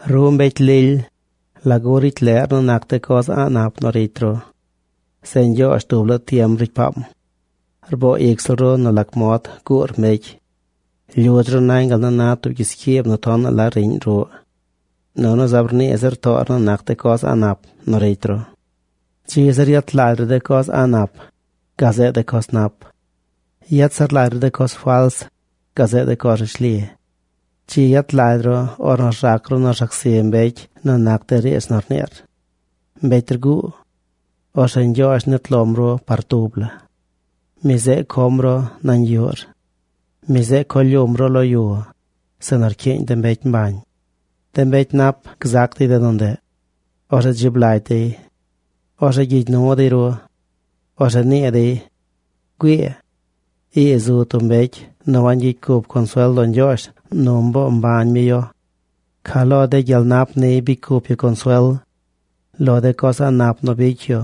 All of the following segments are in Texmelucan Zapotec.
Ru mbecy lily, ¿lagu ricy leꞌr nu nac de coz a̱ꞌ nap nu ricy ru? Zeꞌ Ñgyoozh dub laa tiem ricy paam. Rboo ic ziꞌl ru nu lac mod guur mbecy. Lyudz ru nañ gal nu na tub gyiscyiib nu tonaꞌ la riꞌñ ruꞌ. Nunu zaab rnii zir toor nu nac de coz a̱ꞌ nap nu ricy ru. Dzi zir yet lagy ru de coz a̱ꞌ nap, gazeꞌ de coz nap. Yet zir lagy ru de coz fals, gazeꞌ de coz rishli. Dzi yet lagy ru, ornu rzac ru nu rzac zi mbecy nu nac de riidz nu rniir. ¡Mbecy rguu! Orzeꞌ Ñgyoozh nit lom ru par tub la. Mi zeꞌ com ru nañ yuꞌr. Mi zeꞌ co lyum ru lo yu, zeꞌ nu rcyiiñ de mbecy mbañ. De mbecy nap gzac dey de nu ndeꞌ. Orzeꞌ dzib lagy dey. Orzeꞌ gyigy nu dey ru. Orzeꞌ nii dey: “¡Güii! Ii zu tub mbecy nu wangyicy cup consuel lo Ñgyoozh nu mboo mbañ mi yu. Ca lo de gyel nap niy bicy cup yu consuel. Lo de coz a̱ꞌ nap nu bicy yu,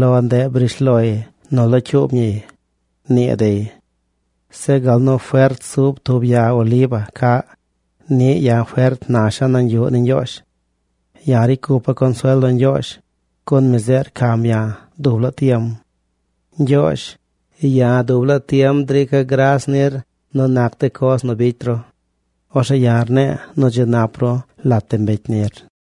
lo ndeꞌ briish loy nu locyuub ñiy”, nii dey. Zeꞌ gal nu fert zub tub ya oliva caꞌ, niꞌ ya̱ fert nasha̱ nañ yuꞌ ni Ñgyoozh. Ya̱ ricy cupa̱ consuel lo Ñgyoozh, gun mi zeꞌ rcam ya̱ dub laa tiem. Ñgyoozh, ya̱ dub la tiem drica̱ gras nir nu nac de coz nu bicy ru. Orzeꞌ ya̱ rne̱e̱ nu dzi nap ru lat de mbecy nir.